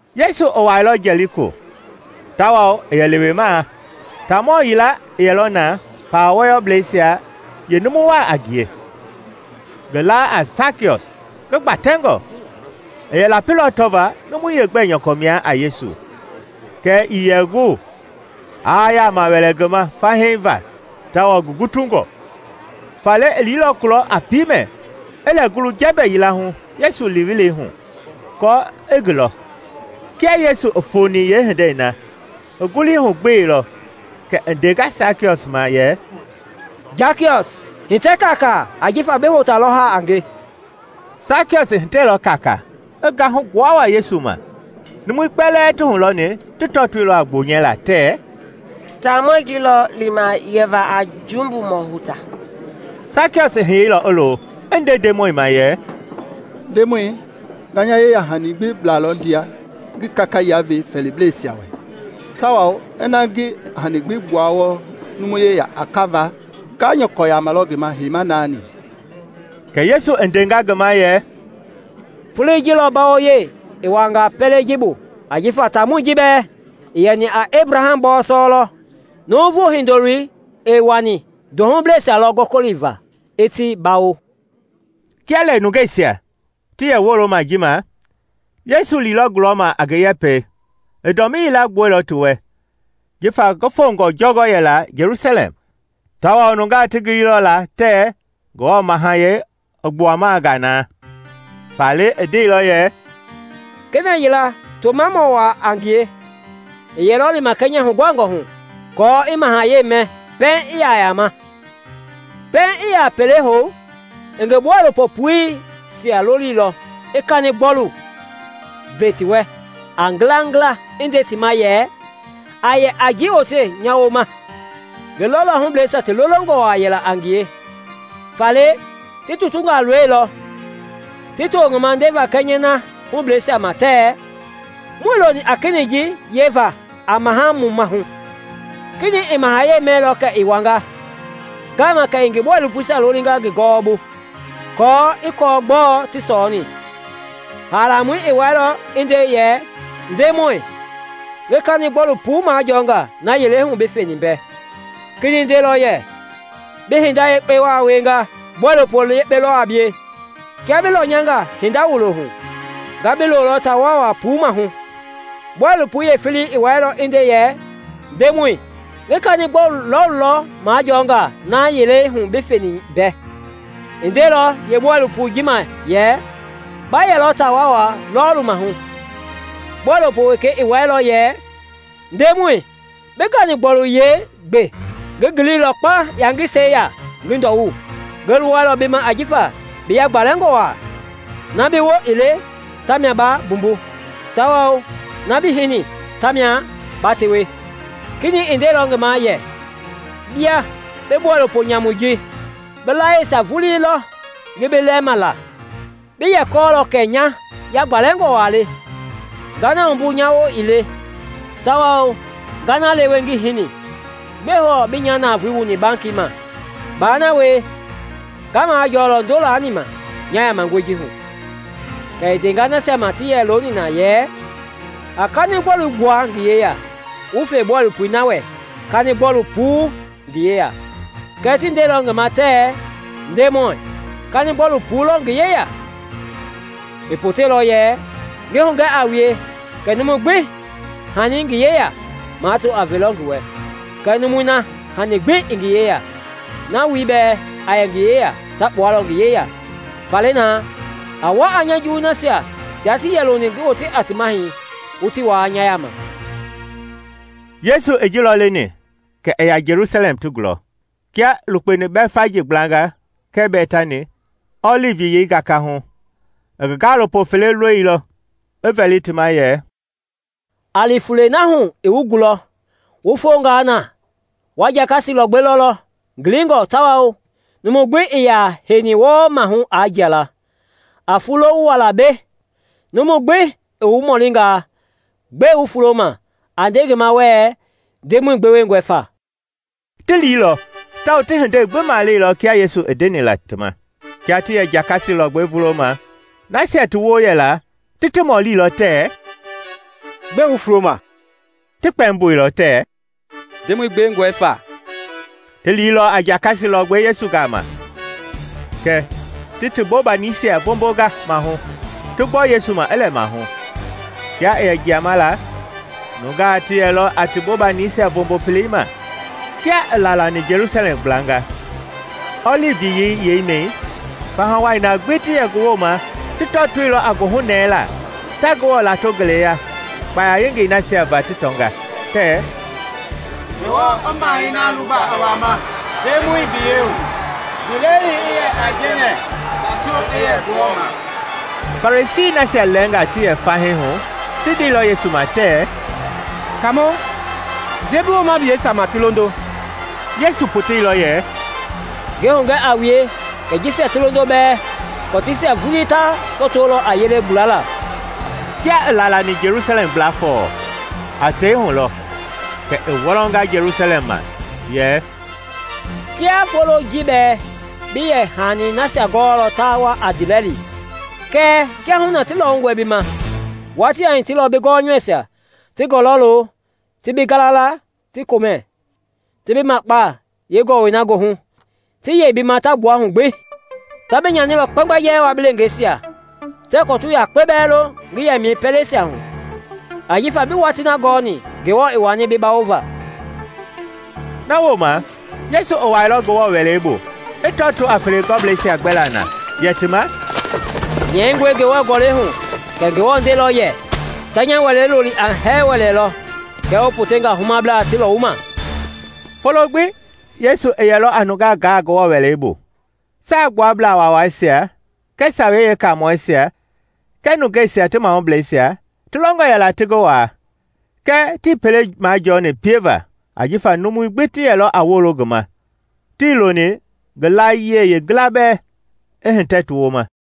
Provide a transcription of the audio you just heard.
Yesu i wuailɔ Jɛliko tawao i yɛ lewemaa. Taamɔ yilaa i yɛlɔ na, pawa wɔyɔblɛisia yeenumu wa a ngie, ngi la a Sakiɔs, ngi gbatɛngɔ. I yɛ lapilɔ tɔvaa numui yeegbɛ nyɔkɔ mia a Yesu kɛɛ ii yɛ gu aa yama wɛlɛ ngi ma fahii va tawao ngi gutungɔ. Faale i liilɔ kulɔ a piimɛ, i lɛ ngulu jɛmbɛ yila hu Yesu li-welei hu aako i ngi lɔ. Kia Yesu i foni yeehindei na, i ngulii hu gbeilɔ kɛ i ndenga Sakiɔs ma yɛ, “Sakiɔs, hitɛ kaakaa ajifa bi hota lɔ haa a nge.” Sakiɔs i hitɛilɔ kaakaa, i gahu gbua wa Yesu ma. Numui kpɛlɛɛ ti hulɔni ti tɔtoilɔ a gbonyɛlaa tɛɛ, “Taamɔi ji lɔ lima yɛva a jumbumɔ hota.” Sakiɔs i hiyeilɔ i lo, i nde Ndemɔi ma yɛ, “Ndemɔi, nga nya yeyahani gbi blalɔ ndia ngi kaka yila ve fɛɛliblɛisia wɛ tawao ina ngi hani gbi gbuanga wɔɔ numu gbi yeya a kava, nga nyɔkɔ yamalɔ ngi ma heima naani.” Kɛ Yesu i ndenga ngi ma yɛ, “Foloi ji lɔ mbawoyei i wuanga pɛlei ji bu ajifa taamɔi ji bɛɛ i yɛni a Ebraham bɔɔsɔ lɔ. Nuuvu Hindoloi i wani ndohubleisia lɔ gɔkɔliva i ti bawo.” Kia lɛ nungeisia ti yɛ woloma ji ma, Yesu liilɔ gulɔma a ngi yɛpɛi i dɔmii yila gbua ti wɛ, jifa ngi fongɔ jɔngɔ yɛla Jelusalɛm, tawao nungaa ti giliilɔ la tɛɛ Ngewɔ Mahayɛi i gbuama nga na. Faale i ndeilɔ yɛ, “Kena yila, tomamɔ wa a ngie, i yɛlɔ lima kɛnyɛ huguhangɔ hu aako i mahayɛi mɛ pɛiŋ i ya yama. Pɛiŋ i ya pele hou, i ngi bɔilopo puisia lolilɔ i kanigbɔlui ve ti wɛ a ngilangila i nde ti ma yɛ, ‘A yɛ a ji wote nya wooma.’ Ngi lɔlɔhubleisia ti lolongɔ yɛla a ngie, faale ti tutungaa loilɔ, ti to ngi ma ndeva kɛnyɛi na hubleisia ma tɛɛ, ‘Muii loni a kenɛi ji yɛva a maha mu mahu.’ “Kenɛi i mahayɛi mɛilɔ kɛ i wanga. Ngama kɛ i ngi bɔilopoisia lolinga ngi gɔwɔbu aako i kɔɔ gbɔɔ ti sɔɔni. Haalamɔi i wɛilɔ i nde yɛ, ‘Ndemɔi, ngi kanigbɔlu puu lɔ majɔnga na yilei hu bi feni mbɛ.’ Kenɛi ndeilɔ yɛ, ‘Bi hinda yekpe wa wienga; bɔilopo yekpe lɔ a bie! Kia bi lɔnyanga hinda wulo hu, nga bi lolɔ taa waawaa puu mahu.’ Bɔilopoi yeefelei i wɛilɔ i nde yɛ, ‘Ndemɔi, ngi kanigbɔlu lɔɔlu lɔ majɔnga na yilei hu bi feni mbɛ.’ I ndeilɔ yeebɔilopoi ji ma yɛ, ‘Ba yɛlɔ taa waawaa lɔɔlu mahu.’ Bɔilopo wekei i wɛilɔ yɛ, ‘Ndemɔi, bi ganigbɔlu yilei gbe; ngi ngiliilɔ kpaŋ yangisɛi ya ngi ndɔwu. Ngi luwɛilɔ bi ma ajifa bi yagbalɛngɔ wa. Na bi woo ii le tamia ba mbumbu tawao na bii hini ta mia ba tewe.’ Kenɛi i ndeilɔ ngi ma yɛ, ‘Bia bi bɔilopo nyamui ji! Bi layiesia vulii lɔ ngi bi lɛɛma la! Bi yɛ kɔɔlɔ kɛ nya yagbalɛngɔ wa le, nga na wumbu nya woo ii le tawao nga na lewe ngii hini. Gbɛe hɔɔ bii nya navoei wuni bankii ma? Ba na wie, nga majɔlɔ ndo laani ma nya yamangɔi ji hu.’ Kɛ i ndenga nasia ma ti yɛ looni na yɛ, ‘A kanigbɔlui gbua ngi yeya wu fe bɔilopoi na wɛ kani-gbɔlu puii i ngi yeya.’ Kɛɛ ti ndeilɔ ngi ma tɛɛ, ‘Ndemɔi, kanigbɔlu puu lɔ ngi yeya!’ I poteilɔ yɛ, ‘Ngi hugɛ a wue kɛ numu gbi hani i ngi yeya, mato a velɔ ngi wɛ; kɛɛ numui na hani gbi ii ngi yeya, na wuloi bɛɛ a yɛ ngi yeya ta kpualɔ ngi yeya. Faale na, a wa a nya juwui nasia tia tii yɛ loni ngi yɛ a ti mahɛi wu ti waa nya yaama!’” Yesu i ji lɔ leni kɛ i ya Jelusalɛm ti gulɔ. Kia i lukpeni Bɛtfaji gblanga kɛɛ Bɛtani, Ɔlivi Yiyei gakahu, i ngi gaalopo fele loilɔ, i vɛli ti ma yɛ, “A li fulei na hu i wu gulɔ; wu fonga na, wa jakasi lɔgbɛ lɔlɔ ngilingɔ tawao numu gbi ii ya heini wɔɔ mahu aa jia la. A fulo wu wa la mbei. Numu gbi i wu mɔlinga gbɛe wu fuloma, a nde ngi ma wɛɛ, ‘Ndemɔi gbewengɔe fa.’” Ti liilɔ tawao ti hindei gbi maleilɔ kia Yesu i ndeni la ti ma. Kia ti yɛ jakasi lɔgbɛi vuloma, nasia ti woo yɛla ti ti mɔlilɔ tɛɛ, “Gbɛe wu fuloma?” Ti kpɛmboilɔ tɛɛ, “Ndemɔi gbewengɔe fa.” Ti liilɔ a jakasi lɔgbɛi Yesu gama. Kɛ ti ti bobanisia voombonga mahu, ti gbɔ Yesu ma i lɛ mahu. Kia i yɛ jiama la, nungaa ti yɛlɔ a ti bobanisia voombo pelei ma. Kia i laalani Jelusalɛm gblanga, Ɔlivi Yiyei yeimɛi, faha wai na gbi ti yɛ ngi wooma ti tɔtoilɔ a goohunɛɛlaa, ta Ngewɔ lato ngeleya kpaya yengei nasia va ti tɔnga, tɛɛ, “Ngewɔ i Mahɛi na luba i wama Ndemɔi biyei hu! Ndiilɛli i yɛ aijɛnɛ, tato i yɛ Ngewɔ ma!” Farisii nasia lɛɛnga ti yɛ fahii hu ti ndeilɔ Yesu ma tɛɛ, “Kaamɔ, nde bi woomableisia ma ti londo!” Yesu poteilɔ yɛ, “Ngi hugɛ a wue kɛ jisia ti londo bɛɛ, kɔtiisia vulii ta tɔtolɔ a yelei gulala.” Kia i laalani Jelusalɛm gbla fɔɔ, a tei hu lɔ, kɛ i wɔlɔnga Jelusalɛm ma, yɛ, “Kiaa foloi ji bɛɛ bi yɛ hani nasia gɔɔlɔ ta wa a ndiilɛli! Kɛɛ kiahuna ti lɔwungɔe bi ma. Watii a hitilɔ bi gɔnyɔuisia ti gɔlɔ lo ti bi gala la ti komɛ, ti bi makpa yeegɔlɔi na goohu, ti yei bi ma ta gbua hu gbi. Ta bi nyanilɔ kpɛmgbɛjɛɛ wua bi leengeisia, tɛɛ kɔtu yakpe bɛɛ lo ngi yɛmɛi pɛleisia hu, ajifa bii watii na gɔni Ngewɔ i wani bi bawova!” Na wooma Yesu i wuailɔ Ngewɔ Wɛlei bu, i tɔtoo a felegɔblɛisia gbɛlaa na, yɛ ti ma, “Nyɛingɔe Ngewɔ Gɔlɛi hu kɛ Ngewɔ ndeilɔ yɛ, ‘Ta nya Wɛlei loli a hɛɛ-wɛlɛ lɔ;’ kɛɛ wu potenga a humablaa ti lɔwuma!” Folo gbi Yesu i yɛlɔ a nungaa gaa Ngewɔ Wɛlei bu. Saagbuablaa Waawaisia kɛɛ Sawei Yeekamɔɛisia kɛɛ nungeisia ti mahubleisia ti longɔ yɛla ti ngi waa, kɛɛ tii pele majɔni pieva ajifa numui gbi ti yɛlɔ a wolo ngi ma, tii loni ngi layie yeengila bɛɛ i hitɛ ti wooma.